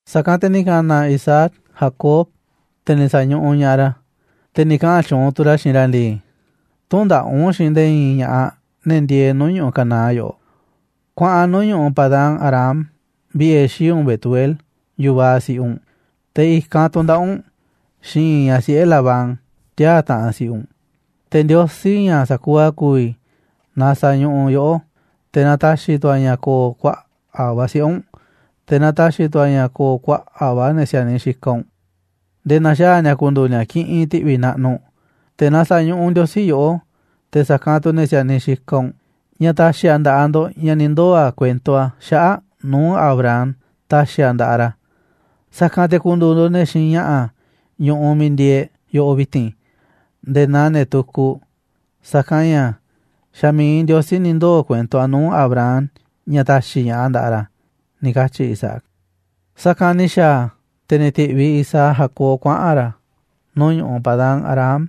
Sa̱kanꞌ te̱ ni̱ ka̱na̱ Isaac Jacob, te̱ ni̱ sa̱ñuꞌuꞌ ña̱ꞌaꞌ ra̱, te̱ ni̱ kaꞌa̱n tyuunꞌ tu̱ ra̱ xiinꞌ ra̱ ndii: ―Tü̱ndaꞌa̱ꞌ u̱nꞌ xiinꞌ nde̱e̱ i̱i̱n ña̱ꞌaꞌ, ne̱ ndieeꞌ nuu̱ꞌ ñu̱ꞌuꞌ Canaán yoꞌoꞌ. Kuaꞌan nuu̱ꞌ ñu̱ꞌuꞌ Padán-arám vi̱ꞌe̱ xii̱ꞌ u̱nꞌ Betuel, yu̱vaꞌ si̱ꞌiꞌ u̱nꞌ, te̱ i̱kanꞌ tu̱ndaꞌa̱ꞌ u̱nꞌ xiinꞌ i̱i̱n ñaꞌ siꞌe̱ Labán, tiaa̱ taꞌanꞌ si̱ꞌiꞌ u̱nꞌ. Te̱ Ndiosí, ña̱ sa̱kuuꞌ a̱ ku̱vi̱, na sa̱ñuꞌuꞌ yoꞌó, te̱ na ta̱xi̱ tu̱ a̱ ña̱ ko̱o̱ kuaꞌa̱ꞌ va̱ siꞌe̱ u̱nꞌ, te̱ na ta̱xi̱ tu̱ a̱ ña̱ ko̱o̱ kuaꞌa̱ꞌ va̱ ne̱ si̱a̱niꞌ xikaꞌ u̱nꞌ, nde̱e̱ na̱xaa̱ ni̱a̱ ku̱ndu̱u̱ ni̱a̱ kiꞌinꞌ ti̱ꞌvi̱ naꞌnuꞌ. Te̱ na sa̱ñuꞌuꞌ Ndiosí yoꞌó, te̱ sa̱kanꞌ tu̱ ne̱ si̱a̱niꞌ xikaꞌ u̱nꞌ, ña̱ ta̱xi̱ a̱ nda̱ꞌaꞌ ndo̱ꞌ ña̱ ni̱ ndoo̱ a̱ kuento a̱ xaꞌa̱ꞌ nuu̱ꞌ Abraham ta̱xi̱ a̱ nda̱ꞌaꞌ ra̱. Sa̱kanꞌ te̱ ku̱ndu̱u̱ ndo̱ꞌ ne̱ xiinꞌ ña̱ꞌa̱ ñu̱ꞌuꞌ miiꞌ ndieeꞌ e̱ꞌ yoꞌoꞌ vi̱ti̱n nde̱e̱ naa ne̱ tukuꞌ, sa̱kanꞌ ña̱ xa̱ mi̱iꞌ Ndiosí ni̱ ndoo̱ kuento a̱ nuu̱ꞌ Abraham ña̱ ta̱xi̱ ña̱ꞌaꞌ a̱ nda̱ꞌaꞌ ra̱ ―ni̱ katyi̱ Isaac. Sa̱kanꞌ ni̱ xa̱a̱ a̱, te̱ ni̱ ti̱ꞌviꞌ Isaac Jacob kuaꞌa̱n ra̱ nuu̱ꞌ ñu̱ꞌuꞌ Padán-arám,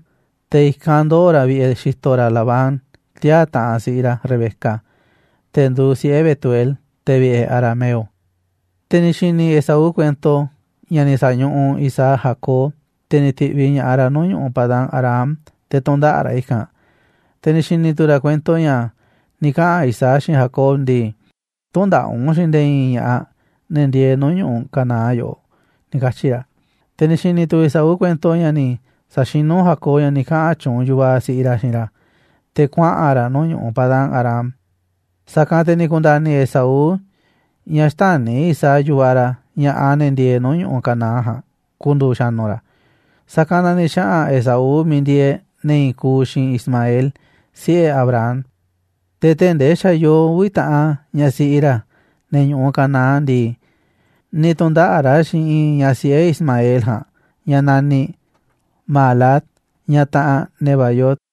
te̱ i̱kanꞌ ndoo̱ ra̱ vi̱ꞌe̱ xi̱to̱ ra̱ Labán, tiaa̱ taꞌanꞌ si̱ꞌiꞌ ra̱ Rebeca, te̱ nduuꞌ siꞌe̱ Betuel, te̱ vi̱ꞌe̱ arameo. Te̱ ni̱ xi̱ni̱ Esaú kuento ña̱ ni̱ sa̱ñuꞌuꞌ Isaac Jacob, te̱ ni̱ ti̱ꞌviꞌ ña̱ꞌaꞌ ra̱ nuu̱ꞌ ñu̱ꞌuꞌ Padán-arám te̱ tu̱ndaꞌa̱ꞌ ra̱ i̱kanꞌ. Te̱ ni̱ xi̱ni̱ tu̱ ra̱ kuento ña̱ ni̱ kaꞌa̱n Isaac xiinꞌ Jacob ndii: "Tü̱ndaꞌa̱ꞌ u̱nꞌ xiinꞌ nde̱e̱ i̱i̱n ña̱ꞌaꞌ ne̱ ndieeꞌ nuu̱ꞌ ñu̱ꞌuꞌ Canaán yoꞌoꞌ", ni̱ katyi̱ ra̱. Te̱ ni̱ xi̱ni̱ tu̱ Esaú kuento ña̱ ni̱ sa̱xinú Jacob ña̱ ni̱ kaꞌa̱n tyuunꞌ yu̱vaꞌ siꞌiꞌ ra̱ xiinꞌ ra̱ te̱ kuaꞌa̱n ra̱ nuu̱ꞌ ñu̱ꞌuꞌ Padán-arám. Sa̱kanꞌ te̱ ni̱ ku̱nda̱ni̱ Esaú ña̱ xtäni̱ Isaac, yu̱vaꞌ ra̱, ña̱ꞌaꞌ ne̱ ndieeꞌ nuu̱ꞌ ñu̱ꞌuꞌ Canaán ja̱a̱nꞌ ku̱ndu̱u̱ xa̱nu̱ ra̱. Sa̱kanꞌ na ni̱ xaꞌa̱n Esaú miiꞌ ndieeꞌ ne̱ i̱i̱n kuuꞌ xiinꞌ Ismael, siꞌe̱ Abraham, te̱ tee̱ꞌ ndee xa̱ yoo uvi̱ taꞌan ñaꞌ siꞌi ra̱ ne̱ ñu̱ꞌuꞌ Canaán ndii, ni̱ tu̱ndaꞌa̱ꞌ ra̱ xiinꞌ i̱i̱n ñaꞌ siꞌe̱ Ismael ja̱a̱nꞌ, ñaꞌ naniꞌ Mahalat, ñaꞌ taꞌanꞌ Nebaiot.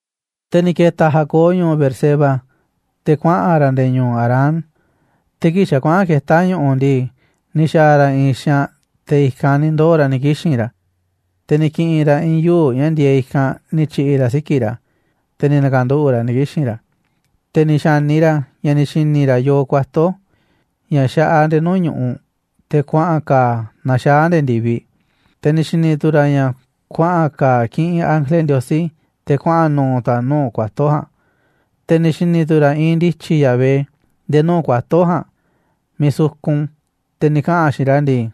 Te̱ ni̱ ke̱ta̱ Jacob ñu̱u̱ Beerseba, te̱ kuaꞌa̱n ra̱ nde̱e̱ ñu̱u̱ Harán. Te̱ kii̱ꞌ xa̱ kuaꞌa̱n ketá ñu̱ꞌu̱ ndii, ni̱ xa̱a̱ ra̱ i̱i̱n xaanꞌ, te̱ i̱kanꞌ ni̱ ndoo̱ ra̱ ni̱ kixi̱n ra̱, te̱ ni̱ ki̱ꞌi̱n ra̱ i̱i̱n yuu̱ꞌ ña̱ ndieeꞌ i̱kanꞌ ni̱ tyi̱ꞌi̱ ra̱ siki̱ꞌ ra̱, te̱ ni̱ na̱ka̱nduꞌu̱ꞌ ra̱ ni̱ kixi̱n ra̱. Te̱ ni̱ xa̱ni ra̱ ña̱ ni̱ xi̱ni̱ ra̱ yoo kuato̱ ña̱ xaꞌaꞌ nde̱e̱ nuu̱ꞌ ñu̱ꞌuꞌ, te̱ kuaꞌa̱n ka̱a̱ a̱ naxaá a̱ nde̱e̱ ndi̱viꞌ, te̱ ni̱ xi̱ni̱ tu̱ ra̱ ña̱ kuaꞌa̱n kaaꞌ kiꞌinꞌ ángele Ndiosí, te̱ kuaꞌa̱n nuuꞌ tu̱ a̱ nuu̱ꞌ kuato̱ ja̱a̱nꞌ. Te̱ ni̱ xi̱ni̱ tu̱ ra̱ iinꞌ ndi̱tyi̱ Yahvé nde̱e̱ nuu̱ꞌ kuato̱ ja̱a̱nꞌ miiꞌ sukun, te̱ ni̱ kaꞌa̱n a̱ xiinꞌ ra̱ ndii: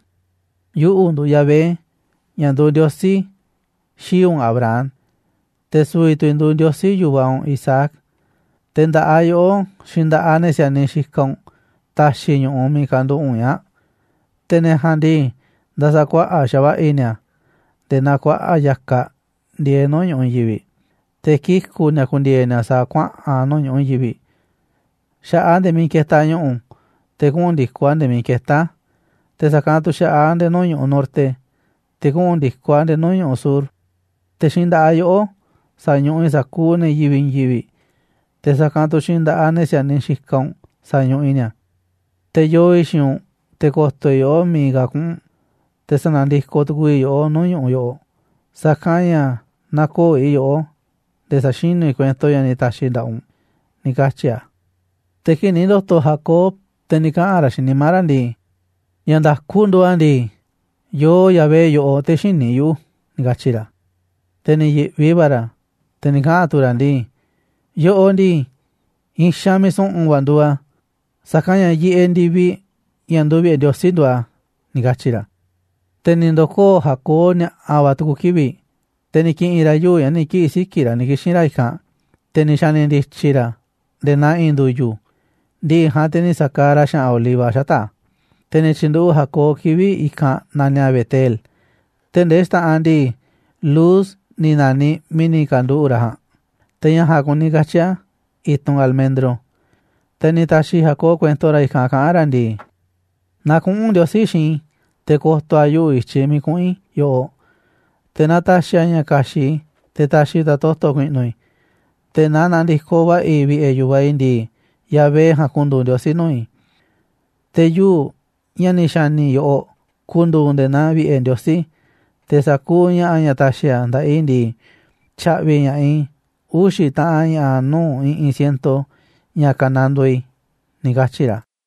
―Yuꞌu̱ nduuꞌ Yahvé, ña̱ nduuꞌ Ndiosí xii̱ꞌ u̱nꞌ Abraham, te̱ su̱vi̱ tu̱ i̱ nduuꞌ Ndiosí yu̱vaꞌ u̱nꞌ Isaac. Te̱ nda̱ꞌaꞌ yoꞌó, xiinꞌ nda̱ꞌaꞌ ne̱ si̱a̱niꞌ xikaꞌ u̱nꞌ ta̱xi̱ i̱ ñu̱ꞌuꞌ miiꞌ kanduꞌu̱ꞌ u̱nꞌ ñaa̱ꞌ. Te̱ ne̱ ja̱a̱nꞌ ndii, nda̱sa̱kuaꞌa̱ꞌ xa̱va̱ꞌa̱ i̱ ni̱a̱ nde̱e̱ naa kuaꞌa̱ꞌ ya̱kaꞌ ndieeꞌ nuu̱ꞌ ñu̱ꞌuꞌ i̱i̱n yivi̱ꞌ, te̱ kiku̱ ni̱a̱ ku̱ndi̱e̱e̱ ni̱a̱ sa̱a̱ kuaꞌa̱n nuu̱ꞌ ñu̱ꞌuꞌ i̱i̱n yivi̱ꞌ, xa̱ꞌaꞌ a̱ nde̱e̱ miiꞌ ketaꞌ ñu̱ꞌu̱, te̱ kuꞌu̱n ndi̱koꞌ a̱ nde̱e̱ miiꞌ ketá a̱, te̱ sa̱kanꞌ tu̱ xa̱ꞌaꞌ a̱ nde̱e̱ nuu̱ꞌ ñu̱ꞌuꞌ norte, te̱ kuꞌu̱n ndi̱koꞌ a̱ nde̱e̱ nuu̱ꞌ ñu̱ꞌuꞌ sur, te̱ xiinꞌ nda̱ꞌaꞌ yoꞌó sa̱ñuꞌuꞌ i̱ sa̱kuuꞌ ne̱ yivi̱ꞌ i̱i̱n yivi̱ꞌ, te̱ sa̱kanꞌ tu̱ xiinꞌ nda̱ꞌaꞌ ne̱ si̱a̱niꞌ xikaꞌ u̱nꞌ sa̱ñuꞌuꞌ i̱ ni̱a̱. Te̱ yoo i̱ xiinꞌ u̱nꞌ, te̱ ko̱to̱ i̱ yoꞌó miiꞌ ka̱ kuꞌu̱n u̱nꞌ, te̱ sa̱na̱ndikoꞌ tu̱ku̱u̱ i̱ yoꞌó nuu̱ꞌ ñu̱ꞌuꞌ yoꞌoꞌ, sa̱kanꞌ ña̱ nä̱ko̱o̱ i̱ yoꞌó nde̱e̱ sa̱xinu̱ i̱ kuento ña̱ ni̱ ta̱xi̱ i̱ nda̱ꞌaꞌ u̱nꞌ ―ni̱ katyi̱ a̱. Te̱ kii̱ꞌ ni̱ ndo̱to̱ Jacob, te̱ ni̱ kaꞌa̱n ra̱ xiinꞌ nimá ra̱ ndii: ―Ña̱ nda̱ku nduuꞌ a̱ ndii, yoo Yahvé yoꞌoꞌ, te̱ xïní yuꞌu̱ ―ni̱ katyi̱ ra̱. Te̱ ni̱ yi̱ꞌvi va̱ ra̱, te̱ ni̱ kaꞌa̱n tu̱ ra̱ ndii: ―Yoꞌoꞌ ndii, i̱i̱n xaanꞌ miiꞌ su̱ꞌu̱n va̱ nduuꞌ a̱, sa̱kanꞌ ña̱ yiꞌeꞌ ndi̱viꞌ, ña̱ nduuꞌ vi̱ꞌe̱ Ndiosí, nduuꞌ a̱ ―ni̱ katyi̱ ra̱. Te̱ ni̱ ndo̱koo̱ Jacob ni̱a̱ꞌa̱ va̱ tu̱ku̱ kivi̱ꞌ, te̱ ni̱ ki̱ꞌi̱n ra̱ yuu̱ꞌ ña̱ ni̱ kiꞌi̱ siki̱ꞌ ra̱ ni̱ kixi̱n ra̱ i̱kanꞌ, te̱ ni̱ xa̱ni̱ ndi̱tyi̱ ra̱ a̱ nde̱e̱ naa i̱i̱n ndu̱yu̱, ndi̱ꞌi̱ ja̱a̱nꞌ te̱ ni̱ sa̱kaaꞌ ra̱ xa̱ꞌa̱n oliva xata̱ꞌ a̱. Te̱ ni̱ tyi̱nduꞌu̱ꞌ Jacob kivi̱ꞌ i̱kanꞌ naniꞌ a̱ Betel, tee̱ꞌ ndee xta̱ꞌanꞌ ndii, Luz ni̱ na̱niꞌ miiꞌ ni̱ ka̱nduꞌu̱ꞌ ra̱ ja̱a̱nꞌ. (Te̱ ña̱ ja̱a̱nꞌ kuni katyi̱ a̱, i̱tunꞌ almendro.) Te̱ ni̱ ta̱xi̱ Jacob kuento ra̱ i̱kanꞌ kaꞌán ra̱ ndii: ―Naaꞌ kuꞌu̱n Ndiosí xiinꞌ i̱, te̱ ko̱to̱ a̱ yuꞌu̱ i̱tyiꞌ miiꞌ kuꞌu̱n i̱ yoꞌoꞌ, te̱ naaꞌ ta̱xi̱ a̱ ña̱ ka̱xi̱ꞌ i̱, te̱ ta̱xi̱ tu̱ a̱ toto̱ ku̱i̱ꞌnu̱ i̱, te̱ naaꞌ na̱ndi̱koꞌ va̱ꞌa̱ i̱ vi̱ꞌe̱ yu̱vaꞌ i̱ ndii, Yahvé ja̱a̱nꞌ ku̱ndu̱u̱ Ndiosí nuu̱ꞌ i̱. Te̱ yuu̱ꞌ, ña̱ ni̱ xa̱ni̱ i̱ yoꞌoꞌ, ku̱ndu̱u̱ nde̱e̱ naa vi̱ꞌe̱ Ndiosí, te̱ sa̱kuuꞌ ña̱ꞌa̱ ña̱ ta̱xi̱ a̱ nda̱ꞌaꞌ i̱ ndii, tya̱ꞌvi̱ i̱ ña̱ꞌaꞌ i̱ uxi̱ taꞌan ña̱ꞌa̱ nuu̱ꞌ i̱ꞌi̱n ciento ña̱ ka̱nandoo i̱ ―ni̱ katyi̱ ra̱.